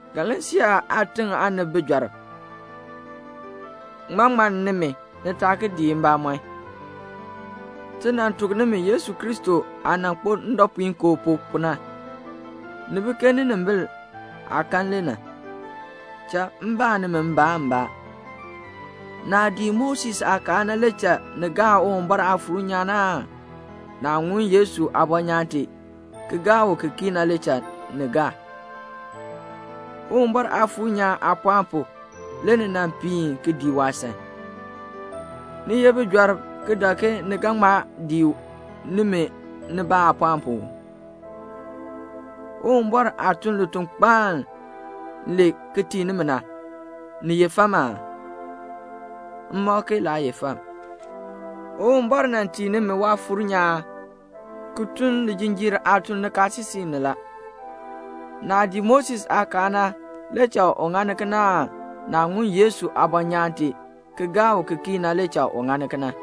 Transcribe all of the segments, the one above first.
Galasia aatiŋ aanib, bijɔrb, ŋmaa ŋmann nimi, ni taa ki dii mbamɔn? Ti nan tuk nimi Yesu Kristo aah nan kpo ndɔpuinkoo pu, pu na. Ni bi ke ninimbil aah kan le na. Cha m baa nimi mbaan mbaa. Naah dii Moses aakaal na le cha ni gaa Uwumbɔr Aafuur nyaan aan naah ŋun Yesu aabɔnyaan tee ki gaa u ki kii na le cha ni gaa? Uwumbɔr Aafuur nyaan aapɔɔn pu, le ni nan piin ki dii waasan. Ni ye bijɔrb ki dak ke ni ga ŋma dii u nimi nibaa aapɔɔn pu uu? Uwumbɔr aah tun litukpaan le ki tii nimi na, ni ye fam aa? M mak ke laa ye fam. Uwumbɔr nan tii nimi Waafuur nyaan ki tun lijinjiir aatun nikaasisik ni la. Naah dii Moses aakaal na le cha u ŋani kena aan naah ŋun Yesu aabɔnyaan tee ki gaa u ki kii na le cha u ŋani kena?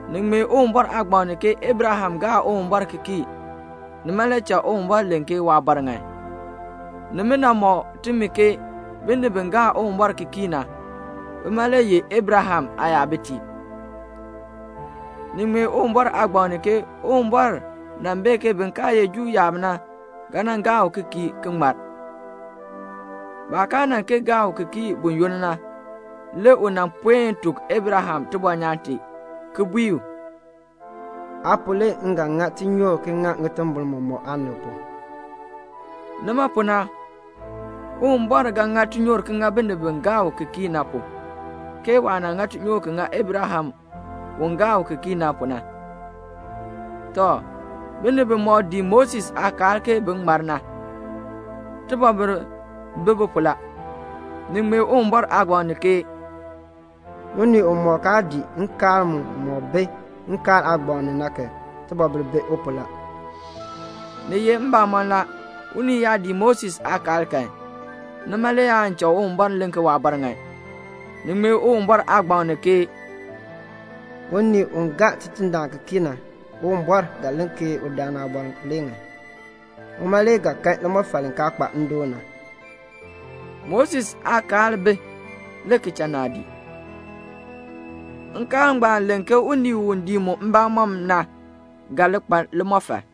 Ni ŋmee Uwumbɔr aagbaŋ ni ke Abraham gaa Uwumbɔr ki kii, nima le cha Uwumbɔr len ke waabɔr ŋan. Nimina mɔk timi ke binib bi gaa Uwumbɔr ki kii na, bima le ye Abraham aayabitiib. Ni ŋmee Uwumbɔr aagbaŋ ni ke Uwumbɔr nan bee ke bin kaa ye Juu yaab na ga nan gaa u ki kii ki ŋmar. Baah kaa nan kee gaa u ki kii buyoonn na, le u nan puen tuk Abraham tibɔnyaan tee, ki bui u, "Aa pu, le m ga ŋa tinyoor ki ŋa ŋitimbol mɔmɔk aanib pu." Nima pu na Uwumbɔr ga ŋa tinyoor ki ŋa binib bi gaa u ki kii na pu, ke waah ŋa tinyoor ki ŋa Abraham u gaa u ki kii na pu na. Tɔ, binib bimɔk dii Moses aakaal ke bin ŋmar na, tibɔbil bi bi pu la. Ni ŋmee Uwumbɔr aagbaŋ ni ke "Unii umɔk kaa dii nkaal mumɔk bi Nkaal aagbaŋ ni na kan, tibɔbil bi u pu la." Ni ye mbamɔn la, unii yaa dii Moses aakaal kan, nima le aan cha Uwumbɔr len ke waabɔr ŋan. Ni ŋmee Uwumbɔr aagbaŋ ni ke "Unii u gaa Tidindaan ki kii na, Uwumbɔr ga len ke udaan aabɔr le ŋan, uma le ga kan limɔfal li kaa kpa ndoon na." Moses aakaal bi, le ki cha naadii. Nkaal ngbaan len ke unii u dii mu mbamɔm na ga li kpa limɔfal.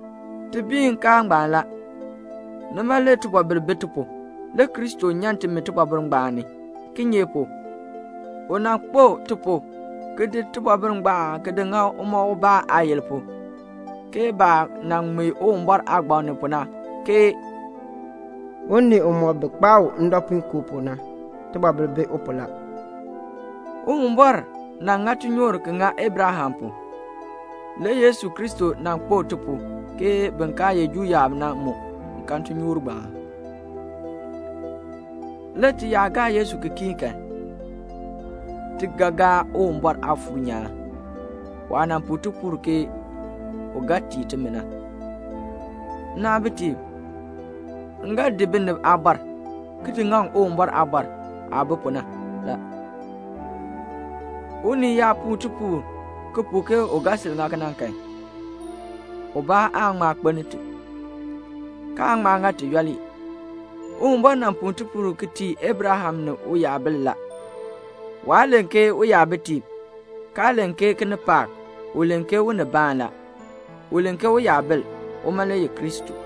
Ti bii nkaal ngbaan la. Nima le tibɔbil bi ti pu. Le Kristo nyan timi tibɔbil ngbaan ni; kinye pu? u nan kpo ti pu ki di tibɔbil ngbaan di ŋa uma ubaa aayil pu, ke baah nan ŋmee Uwumbɔr aagbaŋ ni pu na, ke "Unii umɔk bi kpaa u ndɔpuinkoo pu na, tibɔbil bi u pu la." Uwumbɔr nan ŋa tinyoor ki ŋa Abraham pu. Le Yesu Kristo nan kpo ti pu ke bin kaa ye Juu yaab na mu kan tinyoor ngbaan. Le ti yaa gaa Yesu ki kii kan, ti ga gaa Uwumbɔr Aafuur nyaan, waah nan puu tipuul ti ke u ga tii timi na. Nnaabitiib, m ga di binib aabɔr, ki di ŋaŋ Uwumbɔr aabɔr aah bi pu na la. Unii yaa puu tipuul, ki puu ke u ga sil ŋa kena kan, ubaa aan ŋma kpeln ti, kaan ŋma ŋa ti yooli. Uwumbɔr nan puu tipuul ki tii Abraham ni uyabil la. Waa len ke uyabitiib, kaa len ke kinipaak, u len ke unibaan la. U len ke uyabil. Uma le ye Kristo.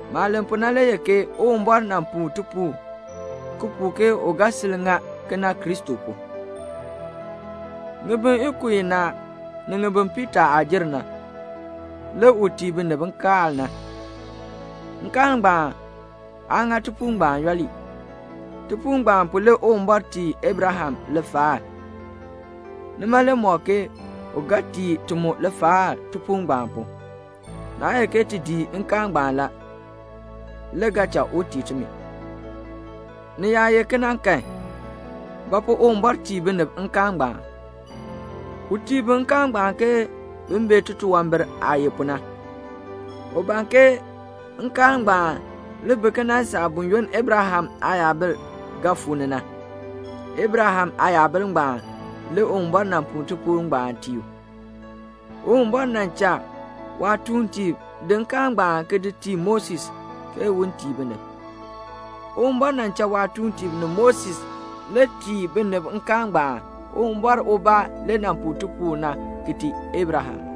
Maah len pu na le ye ke Uwumbɔr nan puu tipuul, ki puu ke u ga sil ŋa kena [Kristo pu]. Ŋibin ikub inaa ni ŋibin piitaa aah jer na, le u tii binib nkaal na. Nkaal ngbaan aa ŋa tipuul ngbaan yooli. Tipuul ngbaan pu le Uwumbɔr tii Abraham lifaal. Nima le mɔk ke u ga tii ti mu lifaal tipuul ngbaan pu. Naa ye ke ti dii nkaal ngbaan la, le ga cha u tii timi. Ni yaa ye kena kan, ba pu Uwumbɔr tii binib nkaal ngbaan? U tii bi nkaal ngbaan ke bin bee titunwambir aah ye pu na. U ban ke nkaal ngbaan li bi ki nan saa buyoonn Abraham aayabil fuu ni na. Abraham aayabil ngbaan le Uwumbɔr nan puu tipuul ngbaan tii u. Uwumbɔr nan cha waatuuntiib di nkaal ngbaan ki di tii Moses, ke un tii binib. Uwumbɔr nan cha waatuuntiib ni Moses le tii binib nkaal ngbaan. Uwumbɔr ubaa le nan puu tipuul na ki tii Abraham.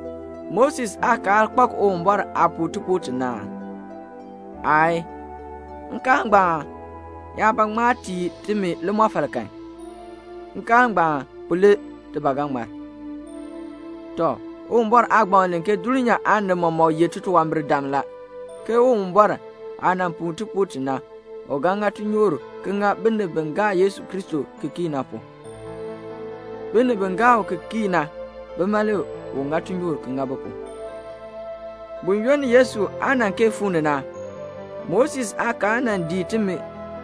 Moses aakaal kpak Uwumbɔr aah puu tipuul ti na aa? Aayii. Nkaal ngbaan yaa ba ŋma tii timi limɔfal kan, nkaal ngbaan pu le ti ba ga ŋmar. Tɔ, Uwumbɔr aagbaŋ len ke dulnyaa aanib mɔmɔk ye titunwambirdam la, ke Uwumbɔr aah nan puu tipuul ti na, u ga ŋa tinyoor ki ŋa binib bi gaa Yesu Kristo ki kii na pu. Binib bi gaa u ki kii na, bima le u ŋa tinyoor ki ŋa bi pu. Buyoonn Yesu aa nan kee fuu ni na, Moses aakaal nan dii timi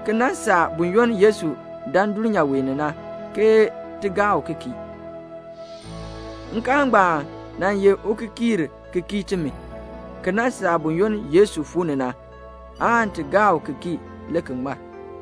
ki nan saa buyoonn Yesu nan dan dulnyaa ni na ke ti gaa u ki kii. Nkaal ngbaan nan ye ukikiir ki kii timi, ki nan saa buyoonn Yesu fuu ni na, aan ti gaa u ki kii le ki ŋmar.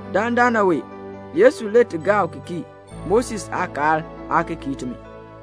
Dandana wee Yesu le ti gaa ki kii. Moses aakaal aa ki kii timi.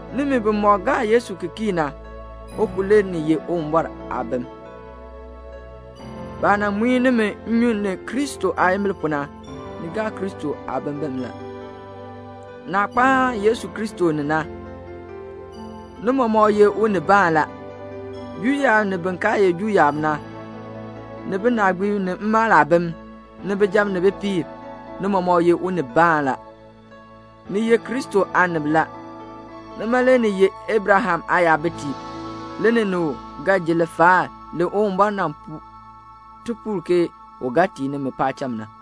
Nimi bimɔk gaa Yesu Kristo ki kii na, u pu le ni ye Uwumbɔr aabim. Baah nan muin nimi nnyun ni Kristo aayimbil pu na, ni gaa Kristo aabimbin la. Naah kpaan Yesu Kristo ni na, ni mɔmɔk ye unibaan la. Juu yaab ni bin kaa ye Juu yaab na, ni binaagbiib ni mmaal aabim, ni bijab ni bipiib, ni mɔmɔk ye unibaan la. Ni ye Kristo aanib la. Nima le ni ye Abraham aayabitiib. Le ni ni u ga ji lifaal li Uwumbɔr nan puu tipuul ke u ga tii nimi paacham na.